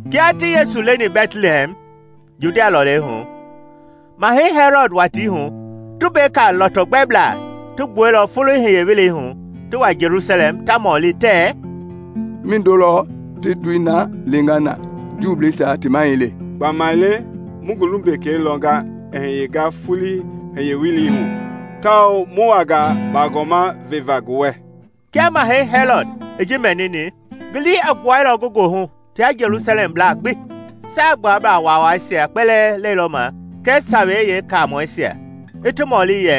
Kia ti Yesu leni Bɛtlihɛm, Judia lɔlei hu, Mahɛi Hɛlɔd watii hu, tumbeka lɔtɔgbɛblaa ti gbuailɔ foloi hiye-welei hu ti wa Jelusalɛm ta mɔli tɛɛ, “Mindo lɔ ti ndoi na leenga na Juubleisia ti Mahɛi le? Gbamaile mu ngi lumbekei lɔnga i gɛnga foloi hiye-welei hu, tawao mu wanga bagɔma veva ngi wɛ.” Kia Mahɛi Hɛlɔd i ji mɛnini, ngi lii i gbuailɔ ngi goohu tia Jelusalɛmblaa gbi. I Saagbuablaa Waawaisia kpɛlɛɛ lɛilɔ ma kɛɛ Sawei Yeekaamɔisia i ti mɔli yɛ,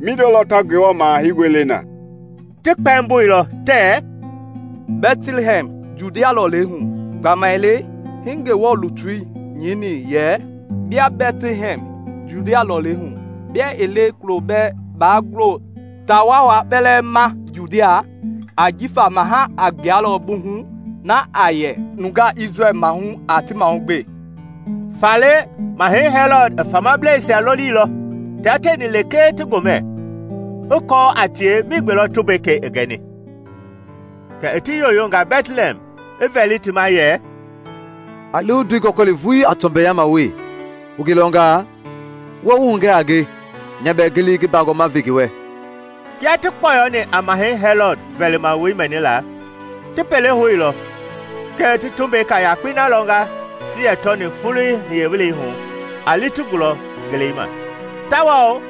“Mindo lɔ ta Ngewɔ Maha Heingɔi le na?” Ti kpɛmboilɔ tɛɛ, “Bɛtlihɛm, Judia lɔlei hu, gbamaile hii Ngewɔ lutui nyɛini yɛ, ‘Bia Bɛtlihɛm, Judia lɔlei hu, bia ii le kulo bɛɛ baa gulo taa waawai kpɛlɛɛ ma Judia; ajifa maha a gbualɔ bi hu, na a yɛ nya nungaa Isrɛl mahu a ti mahugbe.’” Faale Mahɛi Hɛlɔd i famableisia lolilɔ, tia tieni lekee ti gomɛ, i kɔɔ a tie migbe lɔ tumbekei i gɛni. Kɛ i ti yoyonga Bɛtlihɛm, i vɛli ti ma yɛ, “A li wu ndoi gɔkɔli vulii a tɔmbɛyama wee; wu ngi lɔnga wu wa wu hugɛ a nge nya bɛɛ ngi li ngi bagɔma ve ngi wɛ.” Kia ti kpɔyɔni a Mahɛi Hɛlɔd vɛlimawoi mɛnila, ti pele houlɔ kɛ ti tumbeka yakpei na lɔnga ti yɛ tɔni foloi hiye-welei hu a li ti gulɔ ngelei ma. Tawao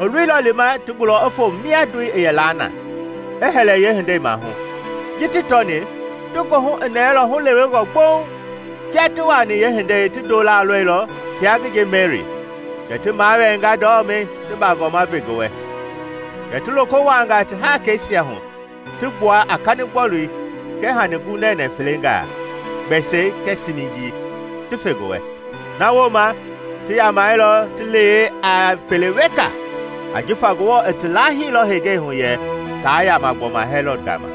i loilɔ lima ti gulɔ i foo mia ndoi i yɛ na, i hɛlɛ yeehindei maahu. Ji ti tɔni, ti goohu i nɛɛlɔ hulewengɔ gboŋ. Kia ti wuaani yeehindei ti ndolaa lɔilɔ tia ngi nje Meri, kɛ ti mawɛɛnga ndɔmɛi ti bagɔma ve ngi wɛ. Kɛ ti loko wuaanga ti haakeisia hu ti gbua a kanigbɔlui kɛɛ hani ngunɛnɛ felengaa, gbɛsɛi kɛɛ siimijii, ti fe ngi wɛ. Na wooma ti yamɛilɔ ti yee a pele weka ajifa Ngewɔ i ti laahilɔ henga hu yɛ taa yaama gbɔma Hɛlɔd gama.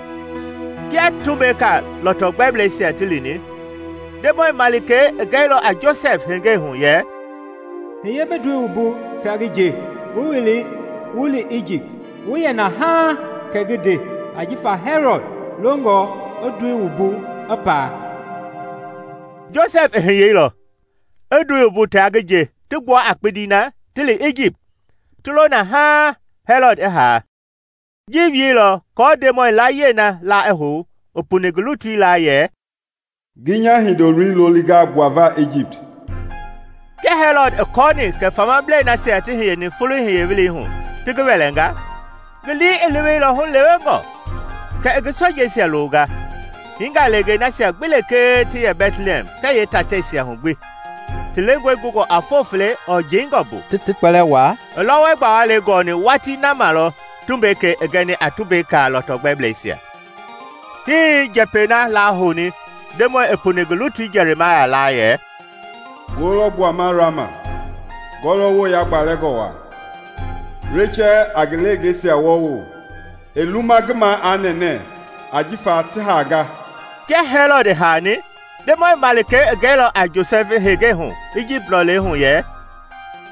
Kia tumbeka lɔtɔgbɛbleisia ti lini, Ndemɔi malikei i gɛilɔ a Josɛfi hengei hu yɛ, “Hiye bi ndoi wumbu tia ngi nje, wu wila wu li Ijipt, wu yɛ na haaŋ kɛ ngi nde; ajifa Hɛlɔd longɔ i ndoi gɔwokpua i paa.” Josɛfi i hiyeilɔ, i ndoi wumbu tia ngi nje ti gbua a kpindi na ti li Ijipt, ti lo na haaŋ Hɛlɔd i haa. Ji wielɔ aako Ndemɔi layie la i hou i puni ngi lutui laa yɛ, “Ngi nya hindoloi lolinga gbuava Ijipt.” Kia Hɛlɔd i kɔɔni kɛ famablei nasia ti hiyeni foloi hiye-welei hu ti ngi wɛlɛnga, ngi lii i leweilɔ hulewengɔ, kɛ i ngi sojeisia longa, hiinga leengei nasia gbi lekee ti yɛ Bɛtlihɛm kɛɛ yeetateisia hu gbi, ti lengɔi gungɔ a foo fele ɔɔ jeingɔ bu, ti ti kpɛlɛɛ waa; i lɔwɔi gbawalei gɔni watii na ma lɔ tumbekei i gɛni a tumbeka lɔtɔgbɛbleisia. Hii njɛpɛi na lahouni Ndemɔi i puni ngi lutui Jɛrimaya laa yɛ, “Ngoo lɔ gbuama Rama, ngɔɔwoo yagbalɛngɔ waa, Rechɛl a ngi leengeisia wɔɔwo; ɛɛ luma ngi maa aa nɛnɛ, ajifa ti haanga.” Kia Hɛlɔd i haani, Ndemɔi malikei i gɛilɔ a Josɛfi hengei hu Ijipt lɔlei hu yɛ,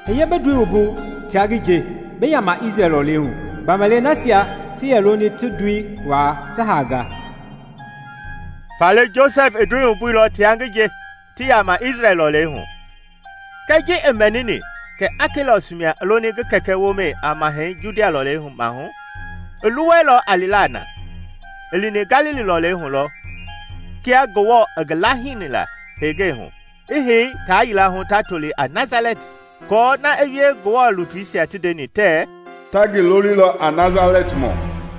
“Hiye bi ndoi wumbu tia ngi nje, bi yaama Isrɛl lɔlei hu, gbamaile nasia ti yɛ loni ti ndoi waa ti haanga.” Faale Josɛfi i ndoi wumbuilɔ tia ngi nje ti yaama Isrɛl lɔlei hu. Kɛɛ ji i mɛnini kɛ Akelɔs mia i loni ngi kɛkɛ womɛi a Mahɛi Judia lɔlei maahu, i luwɛilɔ a lila na; i lini Galili lɔlei hu lɔ kia Ngewɔ i ngi laahini la hengei hu, i hei taa yila hu ta toli a Nasalɛti aako na i wie Ngewɔ lutuisia ti ndeni tɛɛ, “Ta ngi lolilɔ a Nasalɛtimɔ.”